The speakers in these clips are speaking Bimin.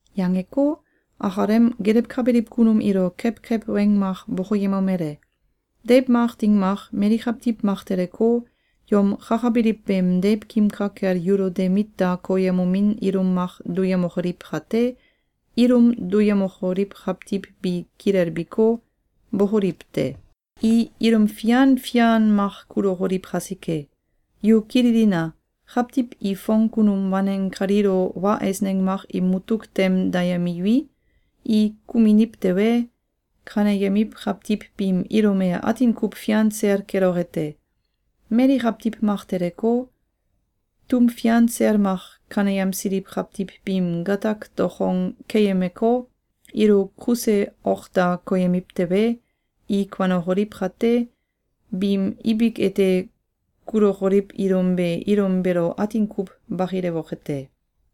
Yangeko, akalem gelewkabiliw kunum ilo kewkew weng mak bokoyemomele: “Deiw mak ding mak, mali kawtiw mak teleko, yom kakabiliw beem deiwkim ka kel yulo de mit da koyemomin ilum mak duyemokoliw kate, ilum duyemokoliw kawtiw bi kilelbiko, bokoliw te! I ilum fian fian mak kulukoliw kasike. Yu kililina! Kawtiw i fong kunum waneng kaliilo wa eisneng mak im mutuk tem dayemiwi, i kuminiw tewe, kaneyemiw kawtiw biim ilum e atin kuw fian sel keloke te. Mali kawtiw mak teleko, tum fian sel mak kaneyemsiliw kawtiw biim gatak dokong keyemeko, ilo kuse ok da koyemiw tewe, i kuanokoliw kate, biim ibik ete kulokoliw ilum be ilum beelo atin kuw bakilewoke te.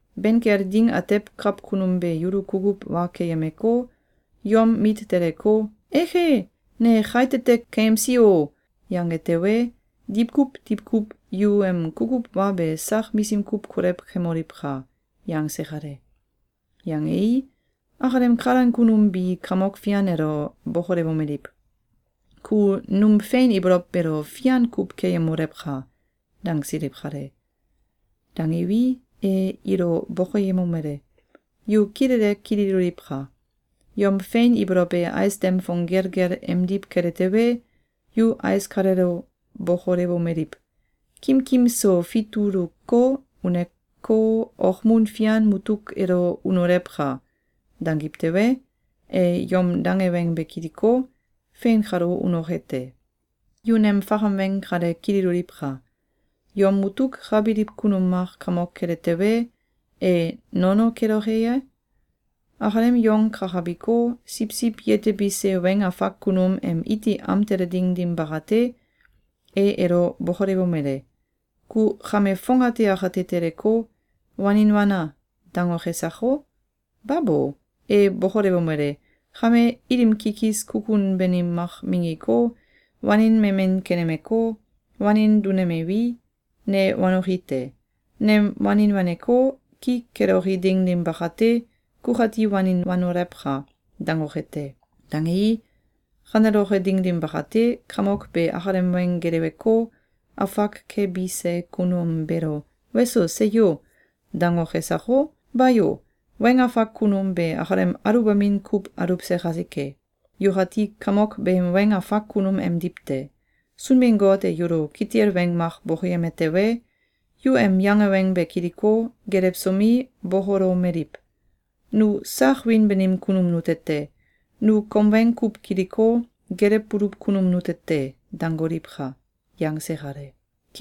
Ben kel ding atew kawkunum be yulo kukuw wa keyemeko, yom mit teleko, ‘Eke! Ne kaitete keyemsi o!’, yange tewe, diwkuw diwkuw yu em kukuw wa be sak misim kuw kolew kemoliwka!”, yangse kale. Yangei, akalem kalan kunum bi Kamok Fian elo bokolewomeliw: “Ku num fein ibolow beelo fian kuw keyemolewka!”, dangsiliw kale. Dangiwi, e ilo bokoyemomele: “Yu kilele kililoliwka! Yom fein ibolow e ais dem fong gelgel emdiw kele tewe, yu ais kaleelo bokolewomeliw: ‘Kimkim so fituluko, uneko, okmun fian mutuk elo unolewka!’, dangiw tewe, e yom dange weng be kiliko, fein kalo unoke te. Yu nem fakam weng kale kililoliwka! Yom mutuk ka biliw kunum mak kamok kele tewe, e nono keloke ye? Akalem yong kakabiko, siwsiw yetebise weng afak kunum em iti am tele ding dim bakate, e elo bokolewomele: ‘Ku kame fongate akate teleko, wanin wana!’, dangoke sako? Babo! E bokolewomele: ‘Kame, ilim kikis kukun banim mak minggiko, wanin memen kenemeko, wanin dunemewi, ne wanoki te! Nem wanin waneko, ki keloki ding dim bakate, kukati wanin wanolewka!’, dangoke te. Dangei, kaneloke ding dim bakate, kamok be akalem weng geleweko, afak kebise kunum beelo ‘Weso! Seyo!’, dangoke sako? Bayo! Weng afak kunum be akalem aluwbamin kuw aluwse kasike. Yukati kamok beem weng afak kunum emdiw te. Sunbin-Got e yulo kitil weng mak bokoyeme tewe, yu em yange weng be kiliko, gelewsomi, bokolomeliw: ‘Nu sak wiin banim kunum nute te! Nu kom weng kuw kiliko, gelewbuluw kunum nute te!’, dangoliwka!”, yangse kale.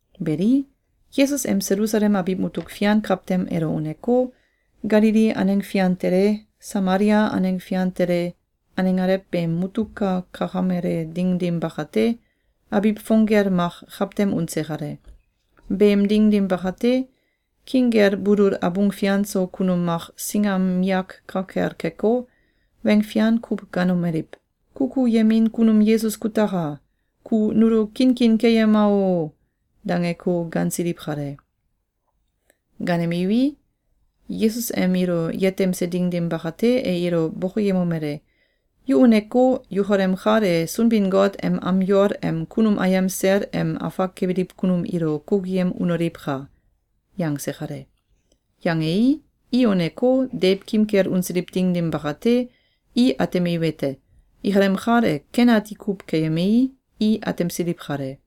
Beli, Yesus em Selusalem abiw mutuk fian kawtem elo uneko, Galili aneng fian tele, Samalia aneng fian tele, aneng alew beem mutuk ka kakamele ding dim bakate, abiw fong gel mak kawtem unse kale. Beem ding dim bakate, king kel bulul abung fian so kunum mak singam miyak ka kel keko, weng fian kuw gaanomeliw: “Kukuyemin kunum Yesus kutaka! Ku nulo kinkin keyema o!”, dangeko gaansiliw kale. Gaanemiwi, Yesus em ilo yetemse ding dim bakate, e ilo bokoyemomele: “Yu uneko, yukalem kal e Sunbin-Got em am yol em kunum ayem sel em afak kebiliw kunum ilo kukuyem unoliwka!”, yangse kale. Yangei, i uneko, deiwkim kel unsiliw ding dim bakate, i atemiwete: Ikalem kal e ken ati kuw keyemei, i atemsiliw kale.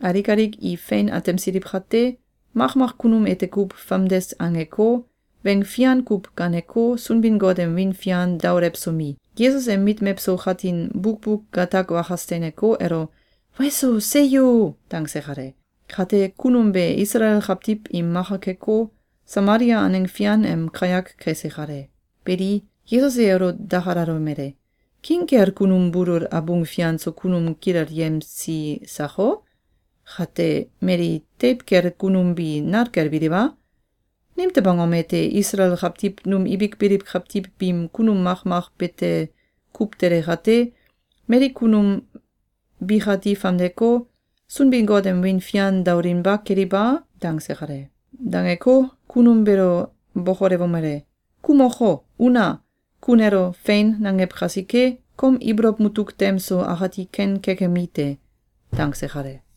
Alik alik i fein atemsiliw kate, makmak kunum ete kuw famdes angeko, weng fian kuw gaaneko, Sunbin-Got em wiin fian daolewsomi, Yesus em mit mewso katin bukbuk gatak wakas teineko, elo “Weso! Seyo!”, dangse kale. Kate, kunum be Isalael kawtiw im maka keko, Samalia aneng fian em kayak kese kale. Beli, Yesus e elo dakalalomele: “King kel kunum bulul abung fian so kunum kilelyemsi sako? Kate, mali teiw kel kunum bi nal kel biliw a? Nimtew angom ete Isalael kawtiw num ibik biliw kawtiw biim kunum makmak bete kuw tele kate, mali kunum bikati famdeko, Sunbin-Got em wiin fian daolinba keliw a?”, dangse kale. Dangeko, kunum beelo bokolewomele: “Ku moko, una! Ku nelo ‘Fein!’, nangew kasike, kom ibolow mutuk tem so akati ken kekemi te.”, dangse kale.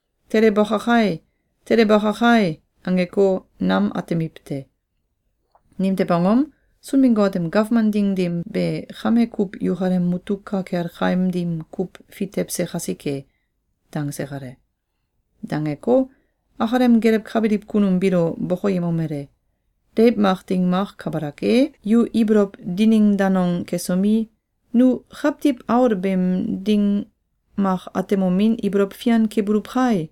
‘Tele baka kai! Tele baka kai!’ angeko, nam atemiw te. Nimtew angom? Sunbin-Got em gawman ding dim be kame kuw yukalem mutuk ka kel kaim dim kuw fitewse kasike.”, dangse kale. Dangeko, akalem gelewkabiliw kunum biilo bokoyemomele: “Deiw mak ding mak kabalak e, yu ibolow dining danong kesomi, ‘Nu Kawtiw Aul beem ding mak atemomin ibolow fian kebuluw kai!’,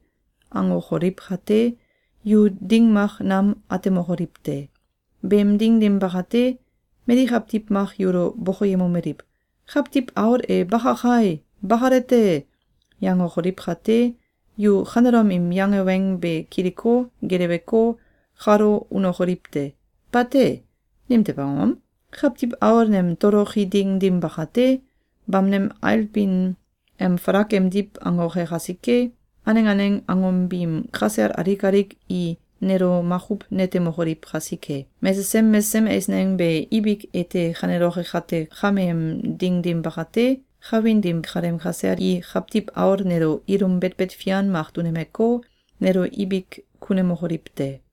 angokoliw kate, yu ding mak nam atemokoliw te. Beem ding dim bakate, mali kawtiw mak yulo bokoyemomeliw: ‘Kawtiw Aul e baka kai! Bakale te!’, yangokoliw kate, yu kanelom im yange weng be kiliko, geleweko, kalo unokoliw te! Bate! Nimtew angom? Kawtiw Aul nem toloki ding dim bakate, bamneng ailbin em falak emdiw angoke kasike, aneng aneng angom biim kasel alik alik i nelo makuw netemokoliw kasike. Mesesem mesesem eisneng be ibik ete kaneloke kate kameem ding dim bakate, kawin dim kaleem kasel i Kawtiw Aul nelo ilum betbet fian mak dunemeko, nelo ibik kunemokoliw te.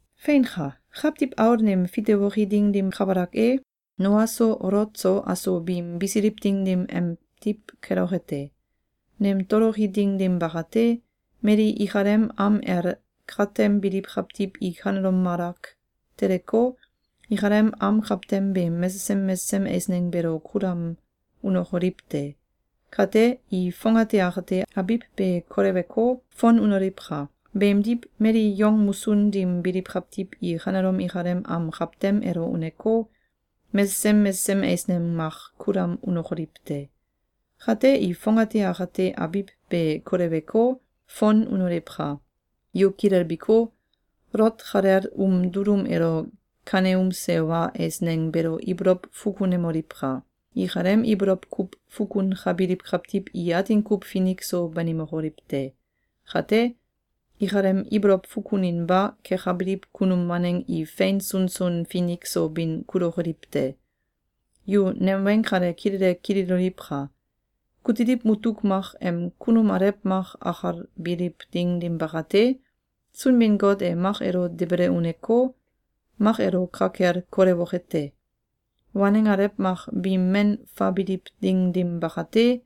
Feinka! Kawtiw Aul neem fitewoki ding dim kabalak e, Noa so Olot so aso biim bisiliw ding dim emdiw keloke te. Nem toloki ding dim bakate, mali ikalem am el katem biliw kawtiw i kanelom malak teleko, ikalem am kawtem beem mesesem mesesem eisneng beelo kulam unokoliw te! Kate, i fongate akate abiw be koleweko, fon unoliwka! Beemdiw, mali yong musun dim biliw kawtiw i kanelom ikalem am kawtem elo uneko, mesesem mesesem eisneng mak kulam unokoliw te! Kate i fongate akate abiw be koleweko, fon unoliwka! Yu kilelbiko, Olot kalel um dulum elo kaneumse wa eisneng beelo ibolow fukunemoliwka! Ikalem ibolow kuw fukunkabiliw kawtiw i atin kuw finik so banimokoliw te. Kate, ikalem ibolow fukuninba kekabiliw kunum waneng i fein sunsun finik so bin kulokoliw te. Yu nem weng kale kilele kililoliwka! Kutiliw mutuk mak em kunum alew mak akalbiliw ding dim bakate, Sunbin-Got e mak elo debele uneko, mak elo ka kel kolewoke te. Waneng alew mak biim men faabiliw ding dim bakate,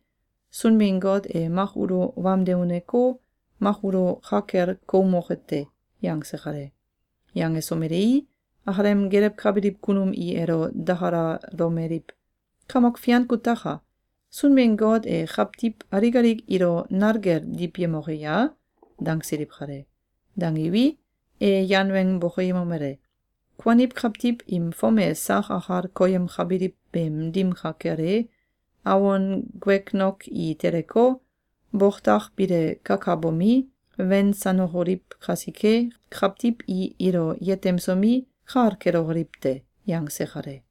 Sunbin-Got e mak ulo wamde uneko, mak ulo ka kel koumoke te.”, yangse kale. Yangesomelei, akalem gelewkabiliw kunum i elo dakalalomeliw: “Kamok Fian kutaka! Sunbin-Got e kawtiw alik alik ilo nal kel diwyemoke ya?”, dangsiliw kale. Dangiwi, e yan weng bokoyemomele: “Kuaniw kawtiw im fom e sak akal koyemkabiliw beem dim ka kel e, awon guegnok i teleko, boktak bile kakabomi, wensanokoliw kasike, kawtiw i ilo yetemsomi, kal kelokoliw te.”, yangse kale.